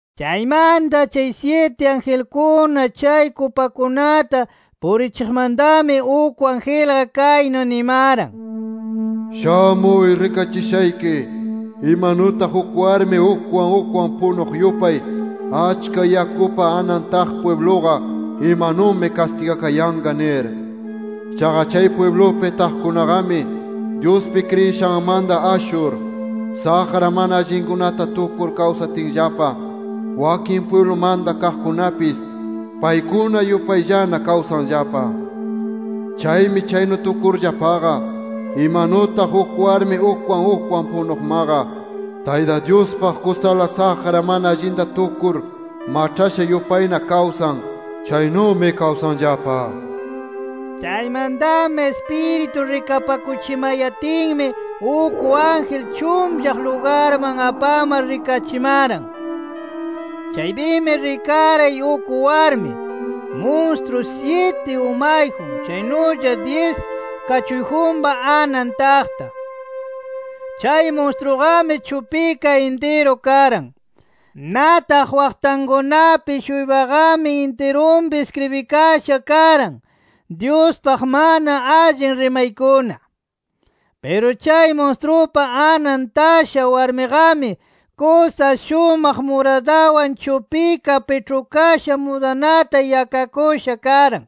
Chaymanta chay syiti angelkuna chay kupakunata purichiqmantami uk angelqa, kaynu nimaran: “Shamuy rikachishayki imanutaq uk warmi ukwan ukwan punuq yupay achka yakupa anan taq pwibluqa imanumi kastigakayanqa nir. Chaqa chay pwiblupi taqkunaqami Dyuspi kriyishanmanta ashur, saqra mana allinkunata tukur kawsatinllapa wakin pwiblumanta kaqkunapis paykuna yupayllana kawsanllapa. Chaymi chaynu tukurllapaqa imanutaq uk warmi ukwan ukwan punuqmaqa Tayta Dyuspaq kusala saqra mana allinta tukur maĉhasha yupayna kawsan, chaynumi kawsanllapa” nir. Chaymantami Ispiritu rikapakuchimayatinmi, uk ángel chunllaq lugarman apamar rikachimaran. Chaypimi rikaray uk warmi, munstru syiti umayjun, chaynulla dyis kachuyjunpa anan taqta. Chay munstruqami chupika intiru karan. Nataq waqtankunapi-shuypaqami intirunpi iskribikasha karan, Dyuspaq mana allin rimaykuna. Piru chay munstrupa anan tasha warmiqami, kusa shumaq muradawan chupika piĉhukasha mudanata yakakusha karan.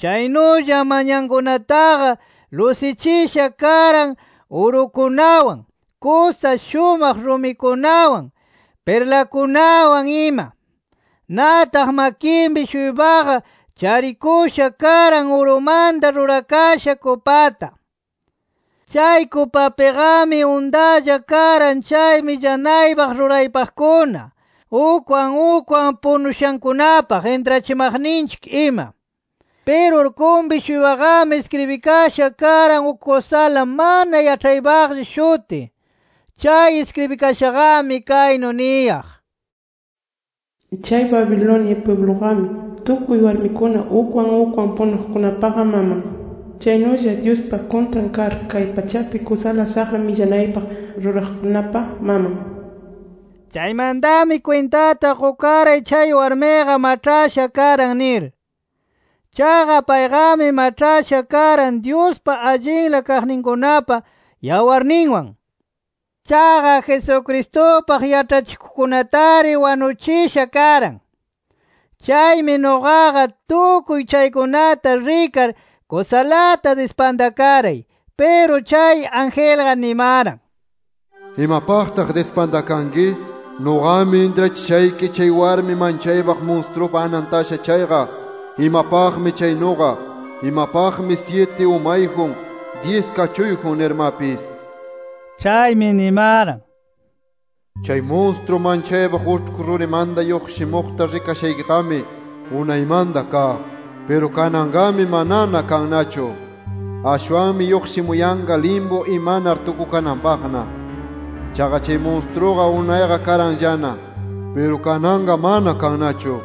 Chaynulla manyankunataqa lusichisha karan urukunawan, kusa shumaq rumikunawan, pirlakunawan ima. Nataq makinpi-shuypaqa charikusha karan urumanta rurakasha kupata. Chay kupapiqami untalla karan chay millanaypaq ruraypaqkuna, ukwan ukwan punushankunapaq intrachimaqninchik ima. Piru urkunpi-shuypaqami iskribikasha karan uk kusala mana yaĉhaypaqlla shuti. Chay iskribikashaqami kaynu niyaq: “Chay Babilonia pwibluqami tukuy warmikuna ukwan ukwan punuqkunapaqa maman. Chaynulla Dyuspa kuntran kar kay pachapi kusala saqra millanaypaq ruraqkunapa maman” nir. Chaymantami kwintata qukaray chay warmiqa maĉhasha karan nir. Chaqa payqami maĉhasha karan Dyuspa allinla kaqninkunapa yawarninwan. Chaqa Jesucristupaq yaĉhachikuqkunatari wanuchisha karan. Chaymi nuqaqa tukuy chaykunata rikar, kusalata dispantakaray. Piru chay angelqa nimaran: “¿Imapaqtaq dispantakanki? Nuqami intrachishayki chay warmi manchaypaq munstrupa anan tasha chayqa imapaqmi chaynuqa, imapaqmi syiti umayjun, dyis kachuyjun nirmapis”. Chaymi nimaran: “Chay munstru manchaypaq uĉhku rurimanta lluqshimuqta rikashaykiqami, unaymanta kaq. Piru kananqami manana kannachu. Ashwanmi lluqshimuyanqa limpu imanar tukukananpaqna. Chaqa chay munstruqa unayqa karanllana. Piru kananqa mana kannachu.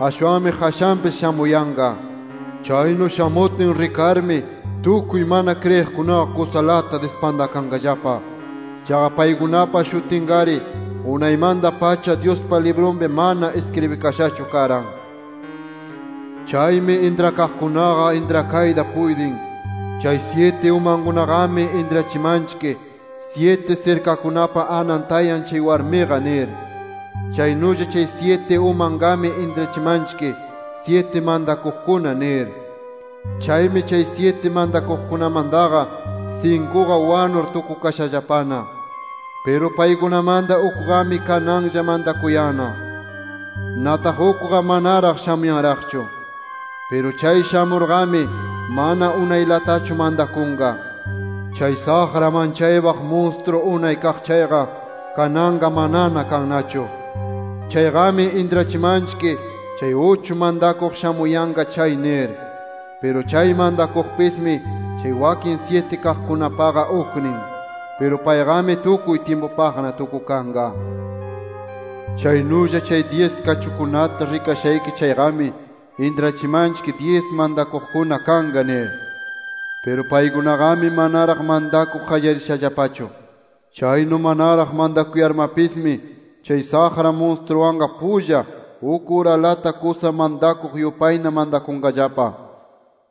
Ashwanmi qashanpis shamuyanqa. Chaynu shamutin rikarmi tukuy mana kriyiqkunaqa kusalata dispantakanqallapa. Chaqa paykunapa shutinqari unaymanta-pacha, Dyuspa librunpi mana iskribikashachu karan. “Chaymi intrakaqkunaqa intrakayta puytin: Chay syiti umankunaqami intrachimanchik, syiti sirkakunapa anan tayan chay warmiqa nir. Chaynulla chay syiti umanqami intrachimanchik, syiti mantakuqkuna nir. Chaymi chay syiti mantakuqkunamantaqa, sinkuqa wanur tukukashallapana. Piru paykunamanta ukqami kananlla mantakuyanna. Nataq ukqa manaraq shamuyanraqchu. Piru chay shamurqami, mana unaylatachu mantakunqa. Chay saqra manchaypaq munstru unay kaq chayqa, kananqa manana kannachu. Chayqami intrachimanchik chay uchu mantakuq shamuyanqa chay nir. Piru chay mantakuqpismi, chay wakin syiti chaykunapaqa uknin. Piru payqami tukuy tyimpupaqna tukukanqa. “Chaynulla chay dyis kachunkunata rikashayki chayqami, intrachimanchik dyis mantakuqkuna kanqa nir. Piru paykunaqami manaraq mantakuq qallarishallapachu. Chaynu manaraq mantakuyarmapismi, chay saqra munstruwanqa pulla, uk uralata kusa mantakuq yupayna mantakunqallapa.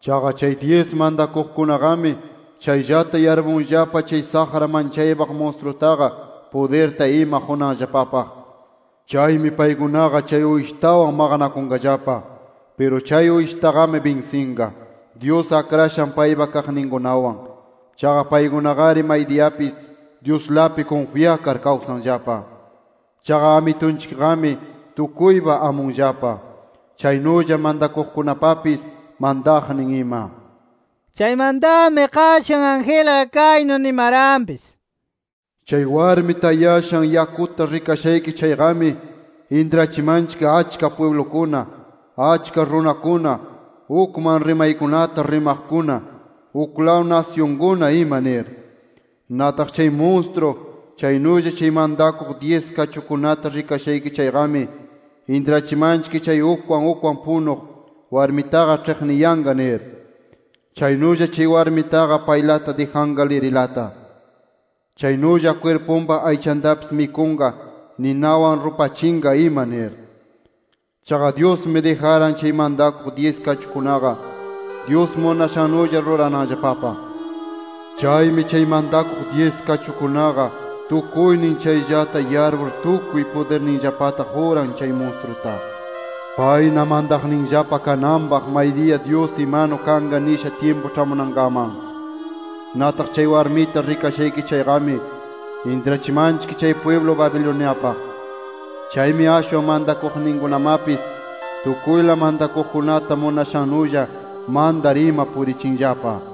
Chaqa chay dyis mantakuqkunaqami, chayllata yarpunllapa chay saqra manchaypaq munstrutaqa pudirta ima qunanllapapaq. Chaymi paykunaqa chay Uyshitawan maqanakunqallapa. Piru chay Uyshitaqami binsinqa, Dyus akrashan paypa kaqninkunawan. Chaqa paykunaqari maydiyapis Dyuslapi kunfyakar kawsanllapa. Chaqa Amitunchikqami, tukuypa amunllapa, chaynulla mantakuqkunapapis mantaqnin ima”. Chaymantami qashan angelqa kaynu nimaranpis: “Chay warmi tayashan yakuta rikashayki chayqami, intrachimanchik achka pwiblukuna, achka runakuna, ukman rimaykunata rimaqkuna, uklaw nasyunkuna ima nir. Nataq chay munstru chaynulla chay mantakuq dyis kachukunata rikashayki chayqami, intrachimanchik chay ukwan ukwan punuq warmitaqa ĉhiqniyanqa nir. Chaynulla chay warmitaqa paylata dijanqa lirilata. Chaynulla kwirpunpa aychantapis mikunqa, ninawan rupachinqa ima nir. Chaqa Dyusmi dijaran chay mantakuq dyis kachukunaqa, Dyus munashannulla rurananllapapaq. Chaymi chay mantakuq dyis kachukunaqa tukuynin chayllata yarpur tukuy pudirninllapata quran chay munstruta, payna mantaqninllapa kananpaq maydiya Dyus imanu kanqa nishan tyimpu ĉhamunankaman. Nataq chay warmita rikashayki chayqami, intrachimanchik chay pwiblu Babiloniapaq. Chaymi ashwan mantakuqninkunamapis tukuyla mantakuqkunata munashannulla mantar ima purichinllapa”.